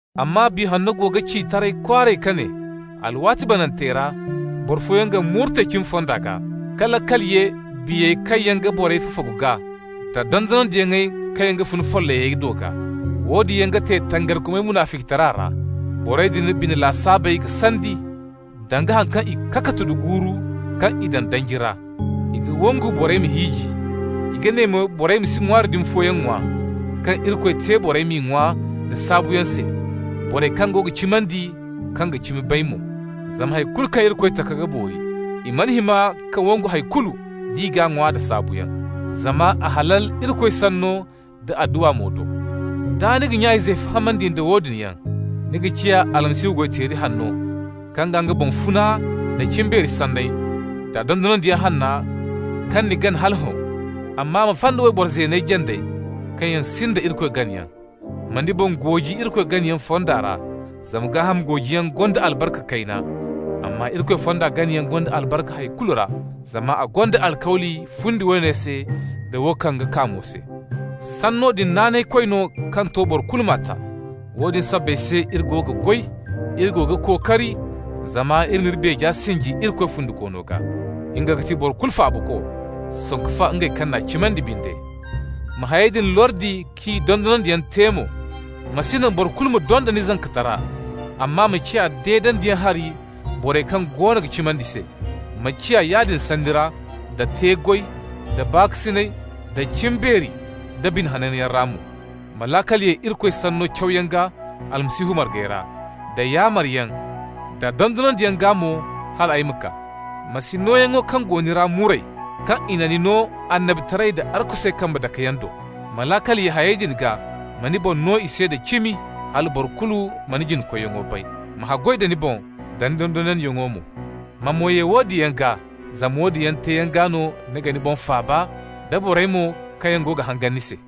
Amma Biya Hanno go ga ci taray kwaaray ka ne: alwaati banantey ra boro fooyaŋ ga murte cimi fonda gaa, ka laakal ye biyey kaŋ yaŋ ga borey fafagu gaa, da dondonandiyaŋey kaŋ yaŋ ga fun follayey do gaa. Woodin yaŋ ga te tangarikomey munaficitara ra. Borey din bine lasaabey ga sandi, danga haŋ kaŋ i kakatu da guuru kaŋ i daŋ danji ra. I ga wangu borey ma hiiji. I ga ne mo borey ma si ŋwaari dumi fooyaŋ ŋwa kaŋ Irikoy te borey m'i ŋwa nda saabuyaŋ se, borey kaŋ go ga cimandi, kaŋ ga cimi bay mo. Zama hay kulu kaŋ Irikoy taka ga boori. I mana hima ka wangu hay kulu d'i g'a ŋwa da saabuyaŋ, zama a halal Irikoy sanno da adduwa mo do. Da ni ga nya-izey fahamandi nda woodin yaŋ, ni ga ciya Almasihu goy-teeri hanno, kaŋ ga nga boŋ funa nda cimbeeri sanney da dondonandiyaŋ hanna kaŋ ni gana hala hõ. Amma ma fay da wayboro zeeney jandey kaŋ yaŋ sinda Irikoy ganayaŋ. Ma ni boŋ gooji Irikoy ganayaŋ fonda ra. Zama gaaham goojiyaŋ gonda albarka kayna, amma Irikoy fonda ganayaŋ gonda albarka hay kulu ra, zama a gonda alkawli fundi woone se da wo kaŋ ga kaa mo se. Sanno din naanaykoy no kaŋ to boro kulu m'a ta. Woodin sabbay se iri go ga goy, iri go ga kookari, zama iri n'iri beeja sinji Irikoy Fundikoono gaa. Nga ga ti boro kulu Faabako, sanku fa ngey kaŋ n'a cimandi binde. Ma hayey din lordi k'i dondonandiyaŋ te mo. Ma si naŋ boro kulu ma donda ni zankatara, amma ma ciya deedandiyaŋ hari borey kaŋ goono ga cimandi se. Ma ciya yaadin sanni ra, da te-goy, da baakasinay, da cimbeeri, da bine hananyaŋ ra mo. Ma laakal ye Irikoy Sanno cawyaŋ gaa Almasihu margey ra, da yaamaryaŋ da dondonandiyaŋ gaa mo, hal ay ma kaa. Ma si nooyaŋo kaŋ go ni ra muray, kaŋ i na ni no annabitaray da arkusey kambe dakeyaŋ do. Ma laakal ye hayey din gaa, ma ni boŋ no i se da cimi, hala boro kulu ma ni jina-koyyaŋo bay. Ma haggoy da ni boŋ da ni dondonandiyaŋo mo, ma mo ye woodin yaŋ gaa, zama woodin yaŋ teeyaŋ gaa no ni ga ni boŋ faaba, da borey mo kaŋ yaŋ go ga hangan ni se.